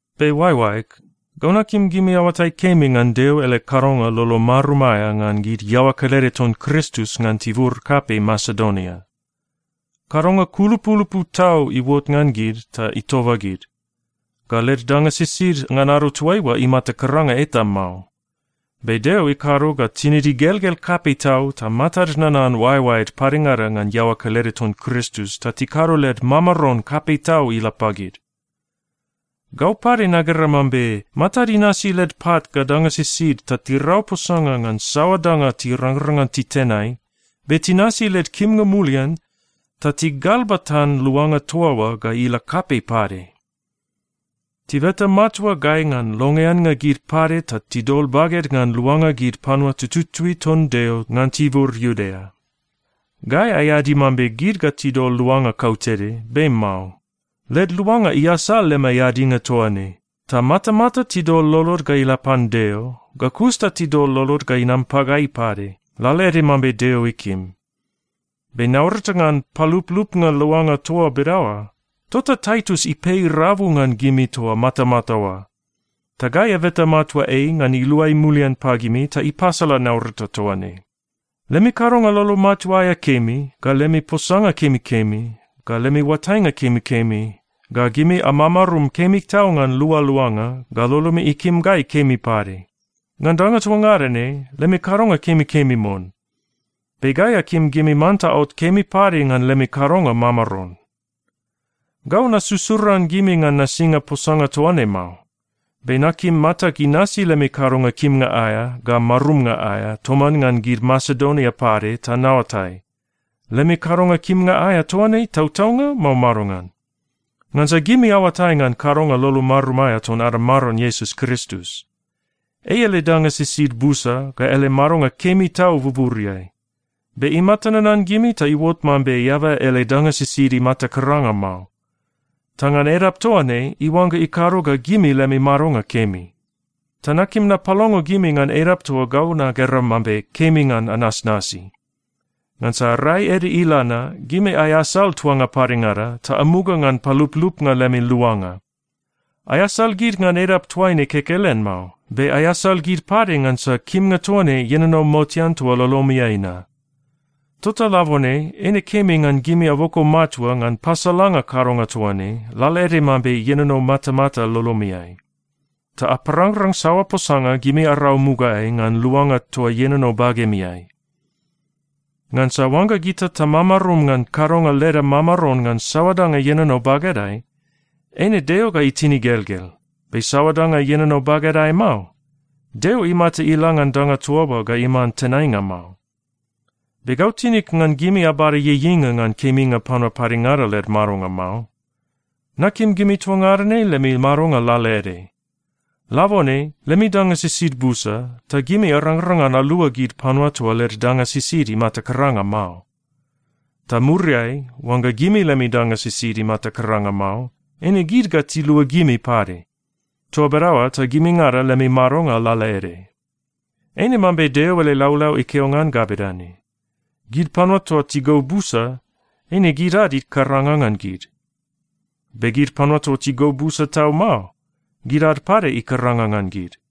Be oaeoaeg, gau nakim gimi aoatai kemi ngan Deo ele kadonga lolo marum aea ngan gid iaoa kelede ton Kristus ngan tibur kapei Masedonia. Kadonga kulupulupu tau iuot ngan gid ta itoba gid. Ga led danga sisid ngan ado toaiua imata karanga eta mao. Be Deo ikado ga tinid igelgel kapei tau ta matad nanan oaeoaed padengada ngan iaoa kelede ton Kristus ta tikado led mamaron kapei tau ila pagid. Gau pade nagera mambe matad inasi led pat ga danga sisid ta tirau posanga ngan saoa danga tirangrang ngan titenai, be tinasi led kimnga mulian ta tigalbatan luanga toa oa ga ila kapei pade. Tibeta matua gai ngan longeannga gid pade ta tidol baged ngan luanga gid panua tututui ton Deo ngan tibur Iudea. Gai aeadi mambe gid ga tidol luanga kautede, be mao. Led luanga iasal lemai eadinga toa ne. Ta matamata tidol lolod ga ila pan Deo, ga kus ta tidol lolod ga inam pagai pade, lalaede mambe Deo ikim. Be naurata ngan paluplupnga luanga toa bedaoa, tota Taitus ipei rabu ngan gimi toa matamata oa. Ta gai abeta matua ei ngan iluai mulian pagimi ta ipasala naurata toa ne. Lemi kadonga lolo matua aea kemi, ga lemi posanga kemikemi, ga lemi oatainga kemikemi, ga gimi amamarum kemi tau ngan lualuanga, ga lolomi ikim gai kemi pade. Ngan danga toa ngada ne, lemi kadonga kemikemi mon. Be gai akim gimi manta aot kemi pade ngan lemi kadonga mamaron. Gau nasusuran gimi ngan nasinga posanga toa ne mao. Be nakim matag inasi lemi kadonga kimnga aea ga marumnga aea toman ngan gid Masedonia pade ta naoatai, lemi kadonga kimnga aea toa ne tautaunga, mao madongan? Ngansa gimi aoatai ngan kadonga lolo marum aea ton ada Maron Iesus Kristus. Ei ele danga sisid busa ga ele madonga kemi tau buburiai. Be imata nanan gimi ta iuot mambe eaba ele danga sisid imata karanga mao. Ta ngan edap toa ne, iuangga ikado ga gimi lemi madonga kemi. Ta nakim napalongo gimi ngan edap toa gau nagera mambe kemi ngan anasnasi. Ngansa rai ede ila na, gimi aeasal tuanga padengada ta amuga ngan paluplupnga lemi luanga. Aeasal gid ngan edap toaine kekelen mao, be aeasal gid pade ngansa kimnga toa ne ienono motean toa lolomiai na. Tota labone eine kemi ngan gimi aboko matua ngan pasalanga kadonga toa ne, lalaede mambe ienono matamata lolomiai. Ta aparangrang saoa posanga gimi arau mugaeai ngan luanga toa ienono bagemiai. Ngansa oangga gita tamamarum ngan kadonga leda mamaron ngan saoa danga ienono bagedai, eine Deo ga itin igelgel. Be saoa danga ienono bagedai mao, Deo imata ila ngan danga toa oa ga iman tenainga mao. Be gau tinig ngan gimi abada ieieinga ngan keminga panua padengada led madonga mao. Nakim gimi toa ngada ne lemi madonga lalaede. Labone lemi danga sisid busa, ta gimi arangrang ngan alua gid panua toa led danga sisid imata karanga mao. Ta muriai, oangga gimi lemi danga sisid imata karanga mao, eine gid ga tilua gimi pade. Toa bedaoa ta gimingada lemi madonga lalaede. Eine mambe Deo ele laulau ikeo ngan ga bedane, “Gid panua toa tigou busa, eine gid ad ikaranga ngan gid, be gid panua toa tigou busa tau mao, gid ad pade ikaranga ngan gid.”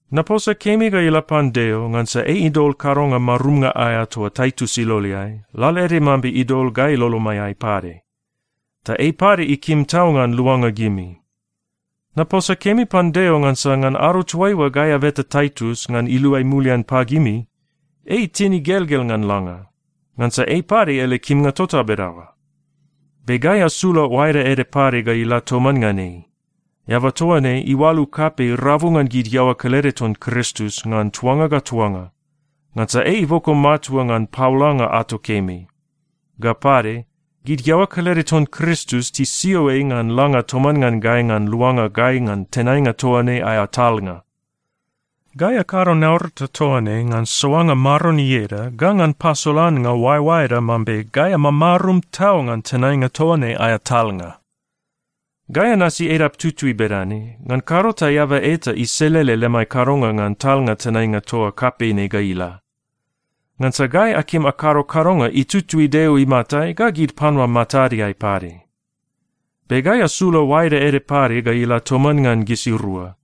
Naposa kemi ga ila pan Deo ngansa ei idol kadonga marumnga aea toa Taitus iloleai, lalaede mambe idol gai lolomaiai pade. Ta ei pade ikim tau ngan luanga gimi. Naposa kemi pan Deo ngansa ngan ado toaiua gai abeta Taitus ngan iluai mulian pagimi, ei itin igelgel ngan langa. Ngansa ei pade ele kimnga tota bedaoa. Be gai asula oaeda ede pade ga ila toman ngan ei. Eaba toa ne iualu kapei rabu ngan gid iaoa kelede ton Kristus ngan tuanga ga tuanga, ngansa ei iboko matua ngan paolanga ato kemi. Ga pade, gid iaoa kelede ton Kristus tisio ei ngan langa toman ngan gai ngan luanga gai ngan tenainga toa ne aea talnga. Gai akado naurata toa ne ngan soanga Maron ieda ga ngan pasolannga oaeoaeda mambe gai amamarum tau ngan tenainga toa ne aea talnga. Gai anasi edap tutui bedane, ngan kado ta eaba eta iselele lemai kadonga ngan talnga tenainga toa kapei ne ga ila. Ngansa gai akim akado kadonga itutui Deo imatai ga gid panua matadeai pade. Be gai asula oaeda ede pade ga ila toman ngan gisirua.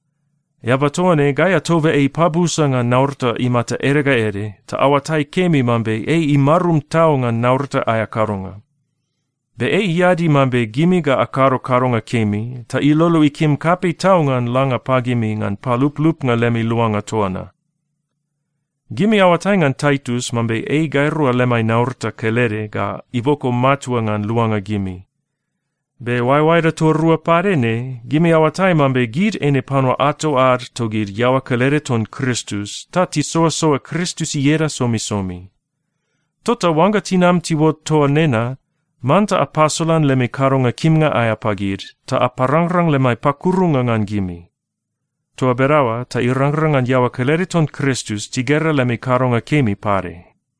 Eaba toa ne gai atoba ei pabusa ngan naurata imata ede ga ede, ta aoatai kemi mambe ei imarum tau ngan naurata aea kadonga. Be ei iadi mambe gimi ga akado kadonga kemi, ta ilolo ikim kapei tau ngan langa pagimi ngan paluplupnga lemi luanga toa na. Gimi aoatai ngan Taitus mambe ei gairua lemai naurata kelede ga iboko matua ngan luanga gimi. Be oaeoaeda toa rua pade ne, gimi aoatai mambe gid eine panua ato ad togid iaoa kelede ton Kristus ta tisoasoa Kristus ieda somisomi. Tota oangga tinam tiuot toa nena, manta apasolan lemi kadonga kimnga aea pagid ta aparangrang lemai pakurunga ngan gimi. Toa bedaoa ta irangrang ngan iaoa kelede ton Kristus tigera lemi kadonga kemi pade.